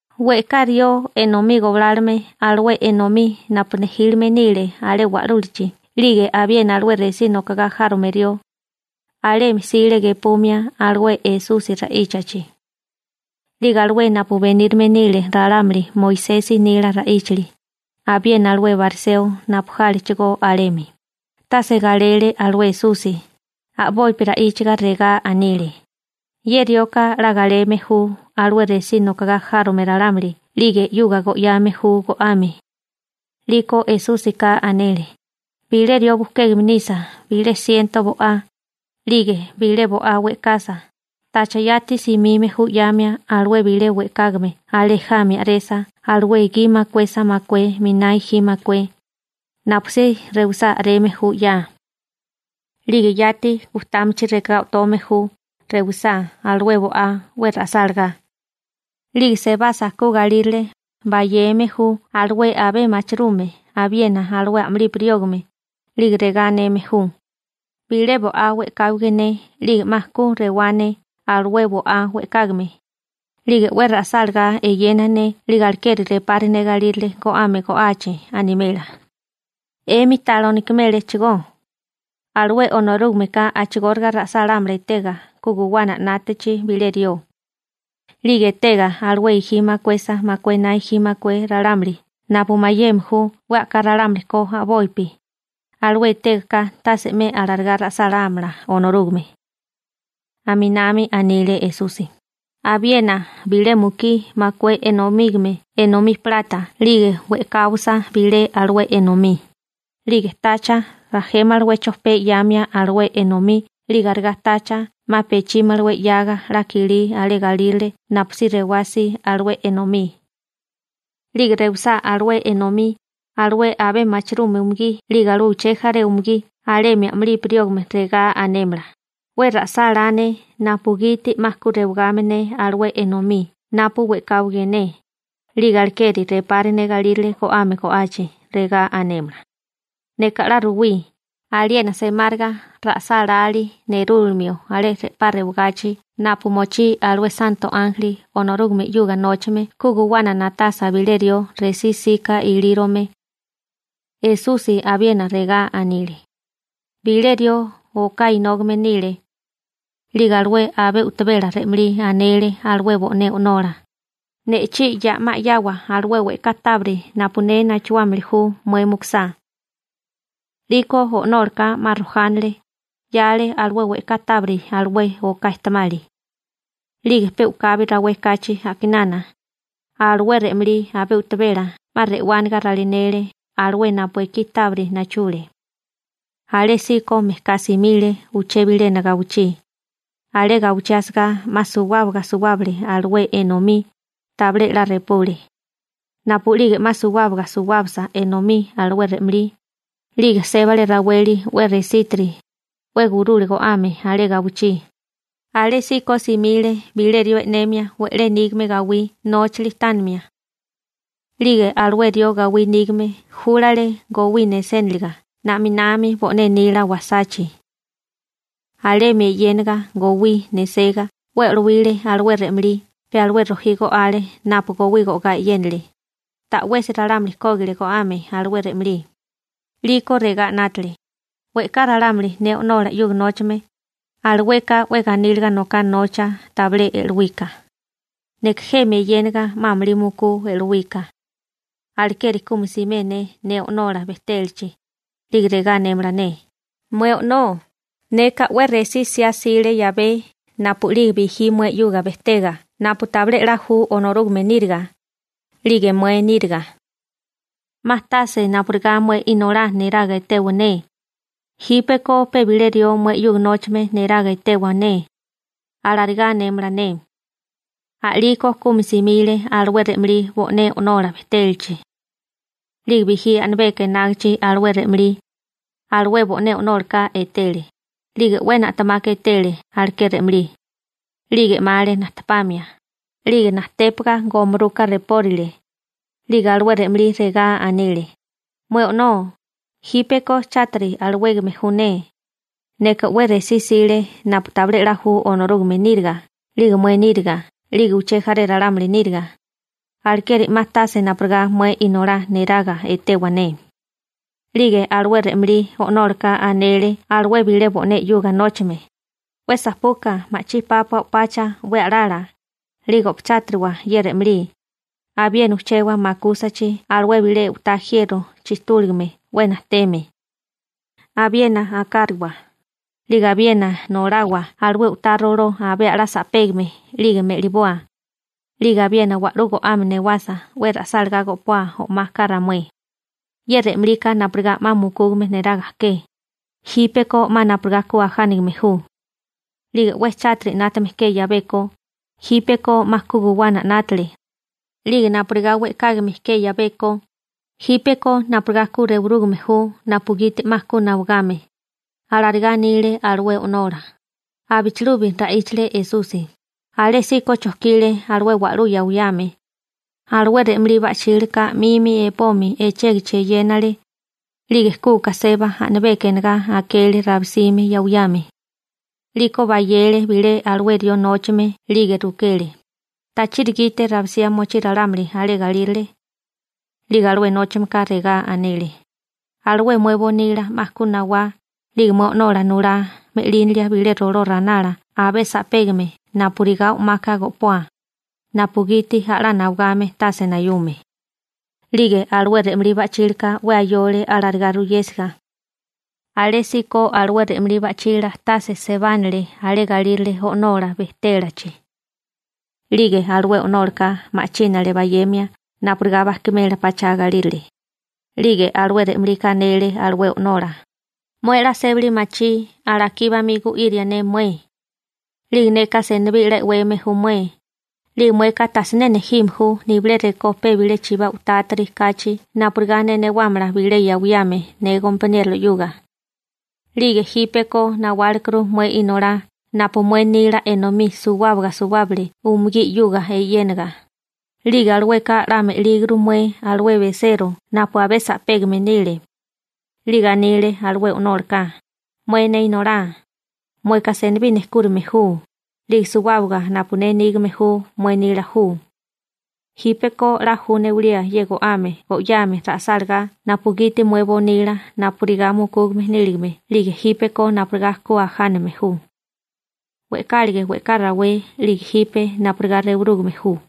We'ká rió enomí goblálome alué enomí napu nejílime nile alé wa'lúlachi. 'Lige abiena alué resí nokogá járome rió, alemi jsile gepumia alué Esusi ra'íchachi. 'Lige alué napu benírame nile ralámuli Moisesi nila ra'íchali, abiena alué bariseo napu jálechigó alemi, tase galele alué Esusi, a'bopi ra'íchaga regá anile: ―Ye rioka 'la galeme ju alué resí nokogá járome ralámuli 'lige 'yuga go'yame ju go'ame. 'Liko Esúsika anele: ―Bilé rió bujkégame nisa bilé siento bo'á, 'lige bilé bo'á we'kasa, ¿tacha yati simime ju 'yamia alué bilé we'kágame alé jami a'resa alué gi makuesa makué miná gi makué? Napusí rewisá a'reme ju 'yaa. 'Lige yati gujtámachi rekagá o'tome ju rewisá alué bo'á 'we ra'sálagá. 'Lige sebasa ku galírale, bayeme ju alué abé machirume abiena alué a'mulipi riógame, 'lige regá aneme ju: «Bilé bo'á we'káwige ne 'lige 'ma ku rewá ne alué bo'á we'kágame, 'lige 'we ra'sálagá eyena ne 'lige alekeri repari ne galírale go'ame go'achi», animela. ¿'Emi ta lonikiméréchigó? Alué Onorúgameka a'chigóriga ra'sálámala etega ku guwana 'nátachi bilé rió. 'Lige etega alué gi makuesa makué na gi makué ralámuli napu mayeme ju 'we a'ká ralámuli ko a'bopi, alué etega ka tase 'me alarigá ra'sálámala Onorúgame. Aminami anile Esusi: ―Abiena, bilé mukí makué enomígame enomí plata 'lige we'kawasa bilé alué enomí, ¿'lige tacha rajémalawé chopé 'yamia alué enomí 'lige arigá tacha 'ma pechímalawé 'yaga 'la kilí alé galírale napusí rewá si alué enomí? 'Lige rewisá alué enomí, alué abé machirume umugí 'lige alué uché jaré umugí alemi a'mulipi riógame regá anémala: «'We ra'sálá ne napugiti 'ma ku rewagame ne alué enomí napu we'káwage ne, 'lige alekeri repari ne galírale go'ame go'achi», regá anémala. Neka 'la ruwí, aliena semáriga ra'sálalí nerúlamio alé re'pá rewagachi napu mochí alué santo ánjeli Onorúgame 'yuga nóchame ku guwana na'tasa bilé rió resí 'sika ilírome. Esusi abiena regá anile: ―Bilé rió oká inógame nile. 'Lige alué abé u'tabela re'malí anele alué bo'né o'nola: «Ne'chí ya'má 'yawa alué we'ká tábiri napu ne nachuámili ju mué mukusá.» 'Liko o'nólaka 'ma rojánale, 'yale alué we'ká tábiri alué oká ejtemali. 'Lige pe u'kabi rawé kachi a'kinana, alué re'malí abé u'tabela 'ma re'wániga ralinele alué napu ekí tábiri nachule. Alésíko mejká simile uché bilena gawichí. Alé gawichí asagá 'ma suwábaga suwábale alué enomí, tabilé 'la repule. Napu'lige 'ma suwábaga suwábasa enomí alué re'malí, 'lige sébale raweli 'we resítiri, 'we gurule go'ame alé gawichí. Alésíko simile bilé rió e'nemia we'lé nígame gawí nóchali tánimia. 'Lige alué rió gawí nígame júlale gowí neséniliga na'minami bo'né nila wasachi. Alemi eyénaga gowí nesegá 'we e'lowile alué re'malí pe alué rojí go'ale napu gowí go'gá e'yénale. Ta'wesi ralámuli kógile go'ame alué re'malí. › 'Liko regá 'nátale: «We'ká ralámuli ne o'nola 'yuga nóchame, alueka 'we ganíliga noká nocha tabilé e'lowika. ¡Neka jemi eyéniga 'ma amulí mukú e'lowika! Alekeri kumi simé ne ne o'nola bejtélachi, 'lige regá anémala ne: ‹‹Mué o'nó, neka 'we resí 'siá 'sile 'yabé napu'lige bijí mué 'yuga bejtega napu tabilé 'la ju Onorúgame níriga 'lige mué níriga. 'Ma tase napurigá mué inolá neraga etewa ne. Jípeko pe bilé rió mué 'yuga nóchame neraga etewa ne, alarigá anémala ne.›› › A'liko kumi simile alué re'malí bo'né o'nola bejtélachi. › 'Lige bijí a'nabeka enágichi alué re'malí, alué bo'né o'nólaka etele, 'lige 'we na'temaka etele aleké re'malí. 'Lige 'male najtepamia, 'lige najtépaga gomuruka repórile. 'Lige alué re'malí regá anile: «Mué o'nó, jípeko chátiri alawégame ju ne. Neka 'we resí 'sile napu tabilé 'la ju Onorúgame níriga 'lige mué níriga 'lige uché jaré ralámuli níriga, alekeri 'ma tase napurigá mué inolá neraga etewa ne.» › 'Lige alué re'malí o'nólaka anele alué bilé bo'né 'yuga nóchame: «'We sapuka ma'chí pápua o'pacha 'we a'lala, 'lige o'pachátiriwa ye re'malí, abiena ujchewa makúsachi alué bilé u'tá jiero chijtúligame 'we najteme. Abiena akáriwa. 'Lige abiena nolawa alué u'tá roló abé a'lá sa'pégame, 'lige me'liboa. 'Lige abiena wa'lú go'ame newasa ra'sálagá go'poa o'maka ramué. Ye re'malika napurigá 'ma mukúgame neraga ke, jípeko 'ma napurigá ku ajánigame ju. 'Lige 'we chátiri 'nátame ke 'yabeko, jípeko 'ma ku guwana 'nátale. 'Lige napurigá we'kágame ke 'yabeko, jípeko napurigá ku rewurúgame ju napugiti 'ma ku nawagame», alarigá anile alué o'nola. Abichilubi ra'íchale Esusi: ―Alésíko chojkile alué wa'lú yawiyame. Alué re'malí ba'chílaka 'mimi epomi echégichi eyénale. 'Lige kuka seba a'nabeka enegá akele rabisime yawiyame. 'Liko bayele bilé alué rió nóchame 'lige rukele: «¿Tachiri gite rabisía mochí ralámuli alé galírale?» 'Lige alué nóchameka regá anele: «Alué mué bonila 'ma ku nawá, 'lige mué o'nola nulá me'línalia bilé roló ranala abé sa'pégame napurigá o'maka go'poa, napugiti a'lá nawagame tase nayume.» › 'Lige alué re'malí ba'chílaka 'we ayole alarigá ruyésiga. Alésíko alué re'malí ba'chila tase sebánale alé galírale o'nola bejtélachi. 'Lige alué o'nólaka ma'chínale bayemia napurigá bajkimela pachá galírale. 'Lige alué re'malika anele alué o'nola: «Mué 'la sébali machí alakí bamí gu'iria ne mué. 'Lige neka senibí 'la e'weme ju mué, 'lige mueka tasiné nejime ju nibilé rekó pe bilé chibá u'tátiri kachi napurigá ne newámala bilé yawiyame ne gompaniérola 'yuga. 'Lige jípeko nawálekuru mué inolá napu mué nila enomí suwábaga suwábale umugí 'yuga eyénaga, 'lige alueka 'la me'líguru mué alué besero napu abé sa'pégame nile.» › 'Lige anile alué o'nólaka: «Mué ne inolá, mueka senibí nejkúrime ju, 'lige suwábaga napu ne nígame ju mué nila ju.» Jípeko 'la ju newalía ye go'ame go'yame ra'sálagá napugiti mué bonila napurigá mukúgame níligame 'lige jípeko napurigá ku ajánagame ju. We'kálige we'ká rawé 'lige jipe napurigá rewurúgame ju.